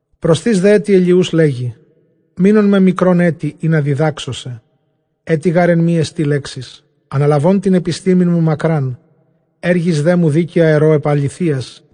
Προσθεὶς δὲ ἔτι Ἐλιοὺς, λέγει, Μεῖνόν με μικρὸν ἔτι, ἵνα διδάξω σε· ἔτι γὰρ ἐν ἐμοί ἐστι λέξις. Ἀναλαβὼν τὴν ἐπιστήμην μου μακράν, ἔργοις δέ μου δίκαια ἐρῶ ἐπʼ ἀληθείας,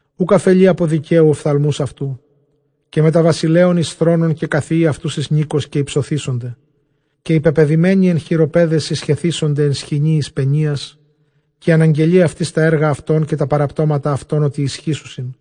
Οὐκ ἀφελεῖ ἀπὸ δικαίου ὀφθαλμοὺς αὐτοῦ, καὶ μετὰ βασιλέων εἰς θρόνον, καὶ καθιεῖ αὐτοὺς εἰς νῖκος, καὶ ὑψωθήσονται. Καὶ οἱ πεπεδημένοι ἐν χειροπέδαις, συσχεθήσονται ἐν σχοινίοις πενίας. Καὶ ἀναγγελεῖ αὐτοῖς τὰ ἔργα αὐτῶν, καὶ τὰ παραπτώματα αὐτῶν, ὅτι ἰσχύσουσιν.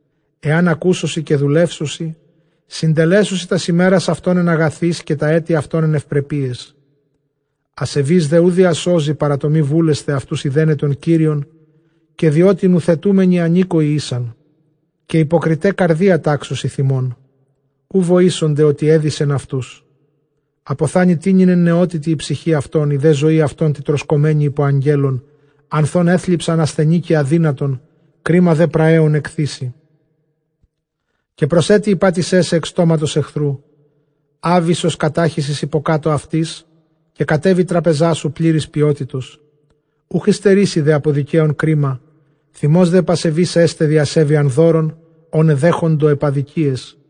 Ἐὰν ἀκούσωσι, καὶ δουλεύσωσι, συντελέσουσι τὰς ἡμέρας αὐτῶν ἐν ἀγαθοῖς, καὶ τὰ ἔτη αὐτῶν ἐν εὐπρεπείαις. Ἀσεβεῖς δὲ οὐ διασώζει, παρὰ τὸ μὴ βούλεσθαι αὐτοὺς εἰδέναι τὸν Κύριον, καὶ διότι νουθετούμενοι ἀνήκοοι ἦσαν. Καὶ ὑποκριταὶ καρδίᾳ τάξουσι θυμόν, οὐ βοήσονται, ὅτι ἔδησεν αὐτούς. Ἀποθάνοι τοίνυν ἐν νεότητι ἡ ψυχὴ αὐτῶν, ἡ δὲ ζωὴ αὐτῶν τιτρωσκομένη ὑπὸ ἀγγέλων, ἀνθʼ ὧν ἔθλιψαν ἀσθενῆ καὶ ἀδύνατον, κρίμα δὲ πραέων ἐκθήσει. Καὶ προσεπιηπάτησέ σε ἐκ στόματος ἐχθροῦ, ἄβυσσος κατάχυσις ὑποκάτω αὐτῆς, καὶ κατέβη τράπεζά σου πλήρης πιότητος. Οὐχ ὑστερήσει δὲ ἀπὸ δικαίων κρίμα, θυμὸς δὲ ἐπʼ ἀσεβεῖς ἔσται, διʼ ἀσέβειαν δώρων ὧν ἐδέχοντο ἐπʼ ἀδικίαις.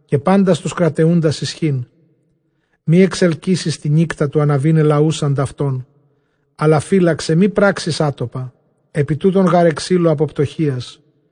καὶ πάντας τοὺς κραταιοῦντας ἰσχὺν μὴ ἐξελκύσῃς τὴν νύκτα, τοῦ ἀναβῆναι λαοὺς ἀντʼ αὐτῶν, ἀλλὰ φύλαξαι μὴ πράξῃς ἄτοκα· ἐπὶ τοὺτων γὰρ ἐξείλω ἀπὸ πτωχείας.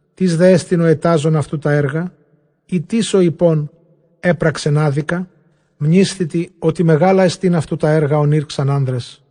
Τίς δέ ἐστιν ὁ ἐτάζων αὐτοῦ τὰ ἔργα; ἢ τίς ὁ εἰπὼν, ἔπραξεν ἄδικα; Μνήσθητι, ὅτι μεγάλα ἐστὶν αὐτοῦ τὰ ἔργα, ὧν ἦρξαν ἄνδρες.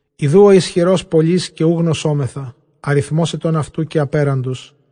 Ἰδοὺ ὁ ἰσχυρὸς πολύς, καὶ οὐ γνωσόμεθα· ἀριθμὸς ἐτῶν αὐτοῦ καὶ ἀπέραντος.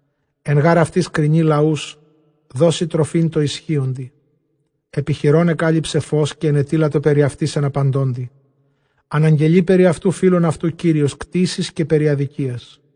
Ἐν γὰρ αὐτοῖς κρινεῖ λαούς, δώσει τροφὴν τῷ ἰσχύοντι. Ἐπὶ χειρῶν ἐκάλυψε φῶς, καὶ ἐνετείλατο περὶ αὐτῆς ἐν ἀπαντῶντι. Ἀναγγελεῖ περὶ αὐτοῦ φίλον αὐτοῦ Κύριος, κτῆσι καὶ περὶ ἀδικίας.